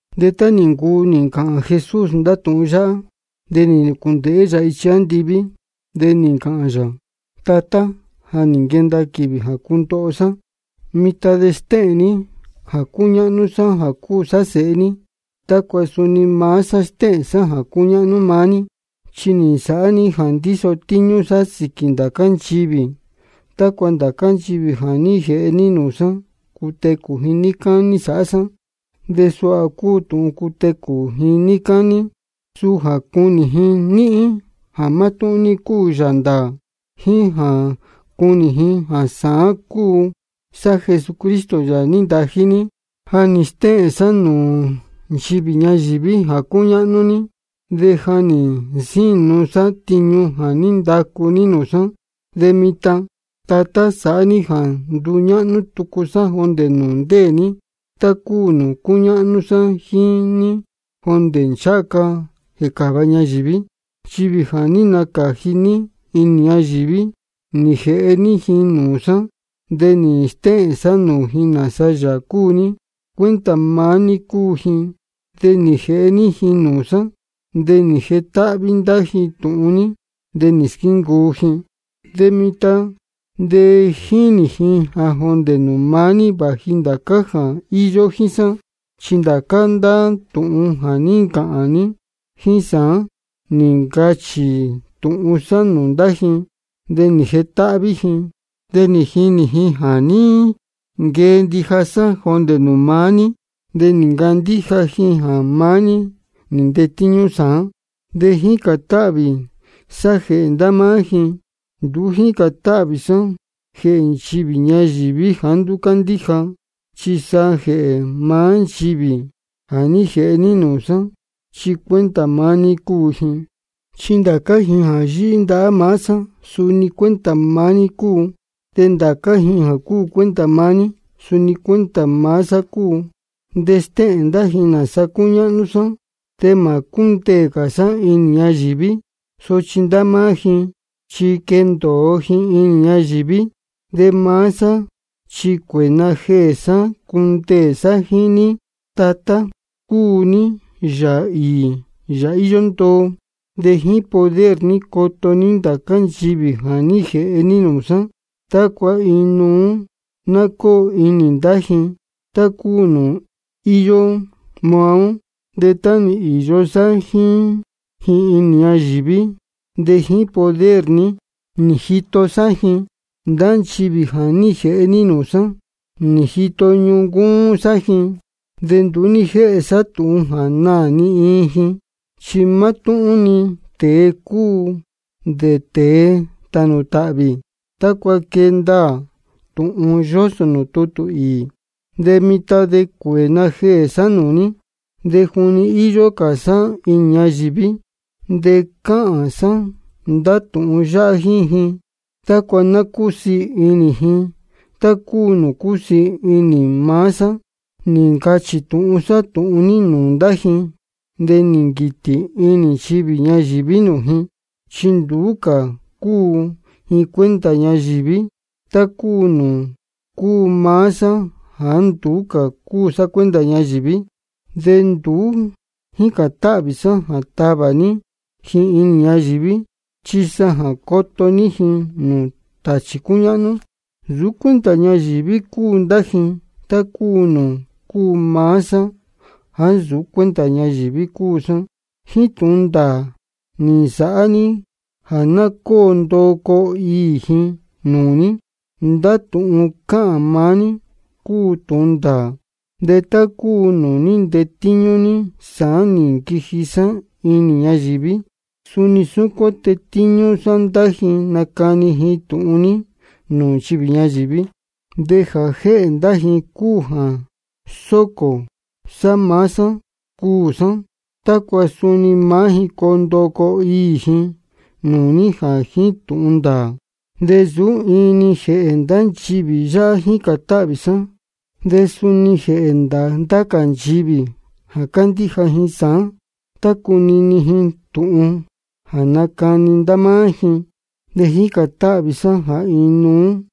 De tá nī ncuu nī ncāhān Jesús ndá tūhun yáhá, de nī nūcūndēhé yā ichi andiví, de nī ncāhān yā: Tatá, ja nī nquenda quīvī jā cundoho sá. Mitan de stéhēn ní jā cúñáhnú sá jā cúu sá Sēhe ní, tácua suni maá sá stéhēn sá jā cúñáhnú maá ní. Chi nī nsāhá ní jā ndíso tíñú sá sīquī ndācá nchivī, tácua ndācá nchivī jā ní jēhe ní nūū sá, cutecū ji níí cání sāhá sá. De suha cúu tūhun cutecū ji níí cání: Suu jā cunī ji níhín jā mátúhún ní cúu Yāā ndāā, jíín jā cunī ji sāán jā cúu sá Jesucristo, Yāā nī ntají ní. Ja nī stéhēn sá nūū nchivī ñayīví jā cúñáhnú ní, de ja nī nsínu sá tiñu jā ní ndacu ní nūū sá. De mitan, Tatá, sāhá ní jā nduñáhnú tucu sá jondē nūū ndéē ní, tá cúu nūū cúñáhnú sá jíín ní jondē ncháha ca jēcāva ñayīví. Nchivī jā ní nacāji ní inī ñayīví, nī jēhe ní ji nūū sá, de nī stéhēn sá nūū ji nāsa Yāā cúu ní. Cuenta maá ní cúu ji, de nī jēhe ní ji nūū sá. De nī jetáhví ndá ji tūhun ní, de nī squíncuu ji. De mitan de jínī ji jā jondē nūū maá ní vāji ndācá jā íyó jíín sá. Chi ndācá ndá tūhun jā ní ncāhān ní jíín sá, nī ncachī tūhun sá nūū ndá ji, de nī jetáhví ji. De nī jinī ji jā ní nquee ndija sá jondē nūū maá ní, de nī ncandíja ji jā maá ní nī ntetíñú sāán. De jícān táhvī sá jēhē ndá máá ji. Nduú jícān táhvī sá jēhē nchivī ñayīví jāá nduú cándíja, chi sa jēhē maá nchivī jā ní jēhe ní nūū sá, chi cuenta maá ní cúu ji. Chi ndācá ji jā yíhí ndahá maá sá, suni cuenta maá ní cúu. De ndācá ji jā cúu cuenta maá ní, suni cuenta maá sá cúu. De stéhēn ndá ji nāsa cúñáhnú sá. De mā cúndeē cā sá inī ñayīví. Sochi ndá máá ji chi quendōo ji inī ñayīví, de maá sá chi cuēē najeē sá cundeē sá jíín ní. Tatá, cúu ní Yāā īī Yāā íyó ndoo. De jíín poder ní coto ní ndācá nchivī jā ní jēhe ní nūū sá, tácua inuú ná cóo inī ndá ji, tá cúu nūū íyó maá ó. De tá nī īyo sá jíín ji inī ñayīví, de jíín poder ní nī jito sá ji. Ndá nchivī jā ní jēhe ní nūū sá, nī jito ñuncúún sá ji. De nduú ní jéhe sá tūhun jā naā ni iin ji, chi mátúhún-ni tēe jā cúu dē tēe tānū tāhvī, tácua quee ndaā tūhun yósō nūū tutū īī. De mitan de cuēē najeē sá nūū ní, de juni íyó cā sá inī ñayīví de cáhān sá ndá tūhun yáhá jíín ji, tácua ná cúsiī ndasí inī ji tá cúu nūū cúsiī inī maá sá. Nī ncachī tūhun sá tūhun ní nūū ndá ji. De nī nquītī inī nchivī ñayīví nūū ji, chi nduú cā cúu ji cuenta ñayīví, tá cúu nūū cúu maá sá jāá nduú cúu sá cuenta ñayīví. De nduú jícān táhvī sá jā tavā ní ji inī ñayīví, chi sa jā coto ní ji nūū tāchī cúñáhnú. Nsūú cuenta ñayīví cúu ndá ji, tá cúu nūū cúu maá sá jāá nsūú cuenta ñayīví cúu sá. Jíín tūhun ndāā ní de sāhá ní jā ná cóo ndoo coo īī ji nūū ní. Ndá tūhun cáhān maá ní cúu tūhun ndāā. De tá cúu nūū ní ntetíñú ní sāán nī nquiji sá inī ñayīví, suni súcuán tétíñú sá ndá ji nacani ji tūhun ní nūū nchivī ñayīví. De jā jéhē ndá ji cúu jā sócō sá maá sá cuū sá, tácua suni maá ji coo ndoo coo īī ji nūū ní jā jíín tūhun ndāā. De nsūú iin-ni jēhē ndá nchivī yáhá jícān táhvī sá, chi suni jēhē ndá cā nchivī jā candíja ji sāán tá cunini ji tūhun jā nacani ndá máá ji. De jícān táhvī sá jā inuú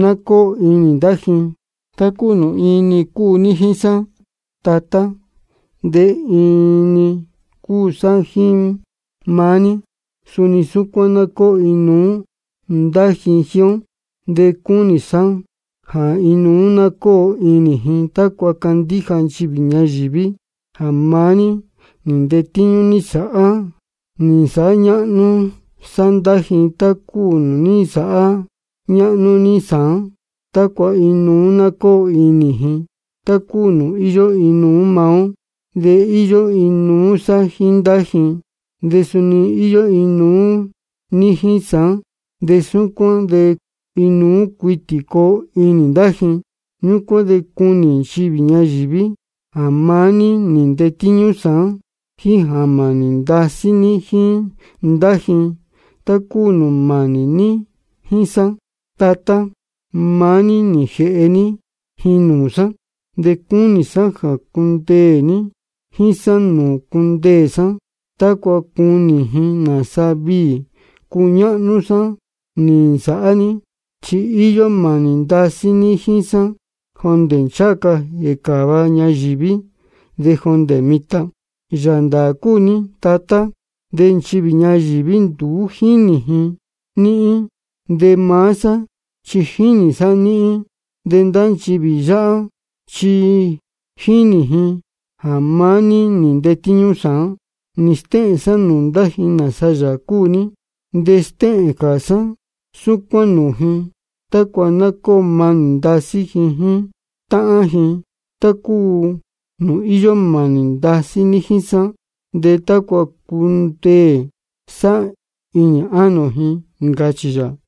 ná cóo inī ndá ji. Tá cúu nūū iin-ni cúu ní jíín sá, Tatá, de iin-ni cúu sá jíín maá ní, suni súcuán ná cóo inuú ndá ji jíín ó. De cúnī sá jā inuú ná cóo inī ji, tácua candíja nchivī ñayīví jā maá ní nī ntetíñú ní sāán. Nī nsāhá ñáhnú sá ndá ji tá cúu nūū ní nsāhá ñáhnú ní sāán, tácua inuú ná cóo inī ji, tá cúu nūū íyó inuú maá ó. De íyó inuú sá jíín ndá ji, de suni íyó inuú ní jíín sá, de súcuán de inuú cuitī coo inī ndá ji. Ñúcuán de cunī nchivī ñayīví jā maá ní nī ntetíñú sāán, jíín jā mānī ndasí ní jíín ndá ji, tá cúu nūū mānī ní jíín sá. Tatá, maá ní nī jēhe ní ji nūū sá. De cúnī sá jā cundeē ji jíín sá nūū cundeē sá, tácua cunī ji nāsa viī cúñáhnú sá nī nsāhá ní. Chi íyó mānī ndasí ní jíín sá jondē ncháha ca jēcāva ñayīví de jondē mitan. Yāā ndāā cúu ní, Tatá, de nchivī ñayīví nduú jínī ji níhín, de maá sá chi jínī sá níhín. De ndá nchivī yáhá chi jínī ji jā maá ní nī ntetíñú sāán. Nī stéhēn sá nūū ndá ji nāsa Yāā cúu ní. De stéhēn cā sá súcuán nūū ji, tácua ná cóo manī ndasí ji jíín táhán ji, tá cúu nūū íyó mānī ndasí ní jíín sá, de tácua cundeē sá inī ánō ji, ncachī yā.